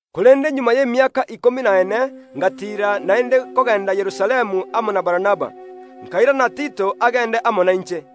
Magega y’emiaka ikomi na ene ngatiira naende kogenda Yerusalemu amo na Barnaba, nkairana Tito agende amo nainche.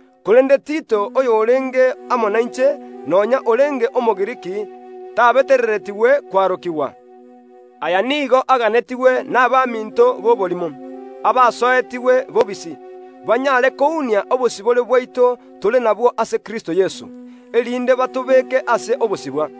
Korende Tito oyorenge amo nainche, nonya orenge Omogiriki, tabetereretigwe kwarokigwa. Aya nigo aganetigwe nabaminto buna akoreke. Abaminto b’oborimo, abasoetigwe bobisi, banyare kounenkia obosibore bwaito tore nabwo ime ase Kristo Yeso, erinde batobeke ase obosibwa.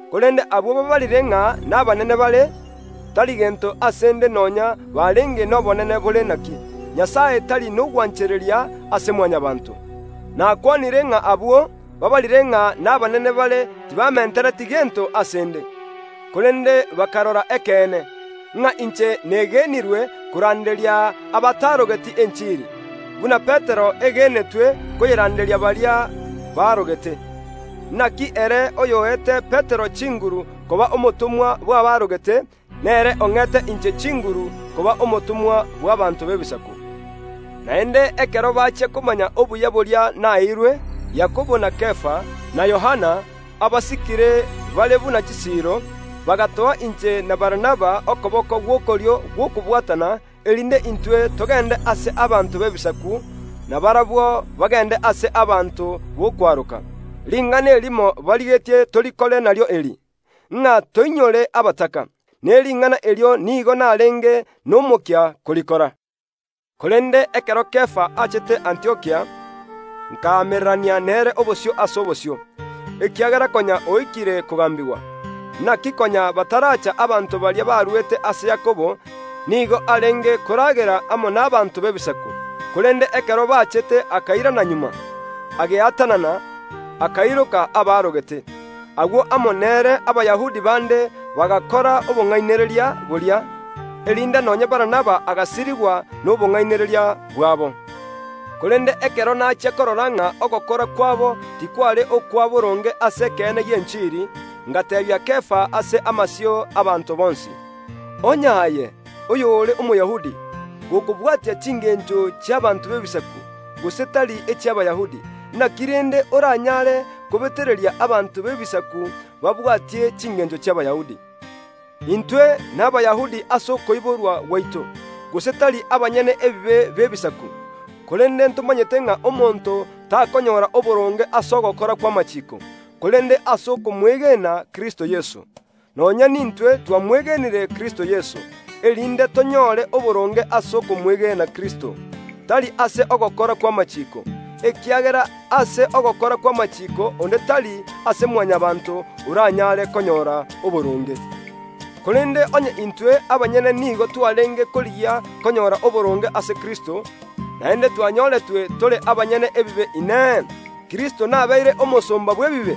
Korende abwo baabarire ng’a nabanene bare (tari gento ase ’nde nonya barenge nobonene bore naki; Nyasae tari nogwanchereria ase Mwanyabaanto), nakwanire ng’a abwo baabarire ng’a nabanene bare tibamentereti gento ase ’nde. Korende bakarora ekeene, ng’a inche negenirwe koranderia abatarogeti enchiri, buna Petero egenetwe koyeranderia baria baarogete. (Naki ere oyoete Petero chinguru koba omotomwa bw’abaarogete, nere ong’ete inche chinguru koba omotomwa bw’abaanto b’Ebisaku.) Naende ekero bachia komanya obuya boria naeirwe, Yakobo na Kefa, na Yohana, abasikire bare buna chisiiro, bagatoa inche na Barnaba okoboko gw’okorio gw’okobwatana, erinde intwe togende ase abanto b’Ebisaku, na barabwo bagende ase abanto b’okwaroka. Ring’ana erimo barigetie tokore nario eri, ng’a toinyore abataka, ne ring’ana erio nigo narenge nomokia korikora. Korende ekero Kefa achete Antiokia, nkaamererania nere obosio ase obosio, ekiagera konya oikire kogambigwa. Naki konya bataracha abanto baria barwete ase Yakobo, nigo arenge koragera amo nabaanto b’Ebisaku; korende ekero bachete akairana magega, ageatanana, akairoka abaarogete. Agwo amo nere Abayahudi bande bagakora obong’ainereria boria, erinde nonya Barnaba agasirigwa nobong’ainereria bwabo. Korende ekero nachia korora ng’a ogokora kwabo tikware okwaboronge ase ekeene gi’enchiri, ngateebia Kefa ase amasio y’abaanto bonsi, “Onye aye, oyore Omoyahudi, gokobwatia chingencho chi’abaanto b’Ebisaku, gose tari echi’Abayahudi, naki rende oranyare kobetereria abanto b’Ebisaku babwatie chingencho chi’Abayahudi?” Intwe n’Abayahudi ase okoiborwa gwaito, gose tari abanyene ebibe b’Ebisaku, korende ntomanyete ng’a omonto takonyora oboronge ase ogokora kw’amachiiko, korende ase okomwegena Kristo Yeso. Nonya nintwe twamwegenire Kristo Yeso, erinde tonyore oboronge ase okomwegena Kristo, tari ase ogokora kw’amachiiko, ekiagera ase ogokora kw’amachiiko onde tari ase Mwanyabaanto oranyare konyora oboronge. Korende onye intwe abanyene nigo twarenge korigia konyora oboronge ase Kristo, naende twanyoretwe tore abanyene ebibe, Inee, Kristo nabeire omosomba bw’ebibe?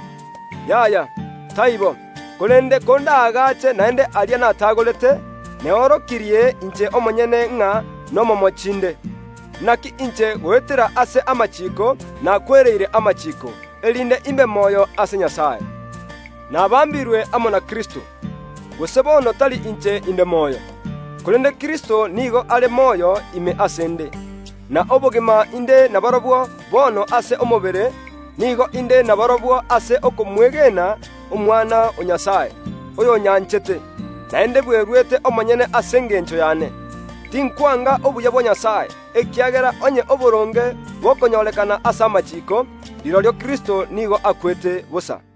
Yaya, taibo! Korende kondaagache naende aria natagorete, neorokirie inche omonyene ng’a nomomochi inde. Naki inche goetera ase amachiiko nakwereire amachiiko, erinde imbe moyo ase Nyasae. Nabambirwe na Kristo ase omosalaba, gose bono tari inche inde moyo, korende Kristo nigo are moyo ime ase ’nde; na obogima inde naborobwo bono ase omobere, nigo inde naborobwo ase okomwegena Omwana o Nyasae, oyonyanchete, naende bweruete omonyene ase engencho yane. Tinkwanga obuya bwa Nyasae, ekiagera onye oboronge bokonyorekana ase amachiiko, rirorio Kristo nigo akwete bosa.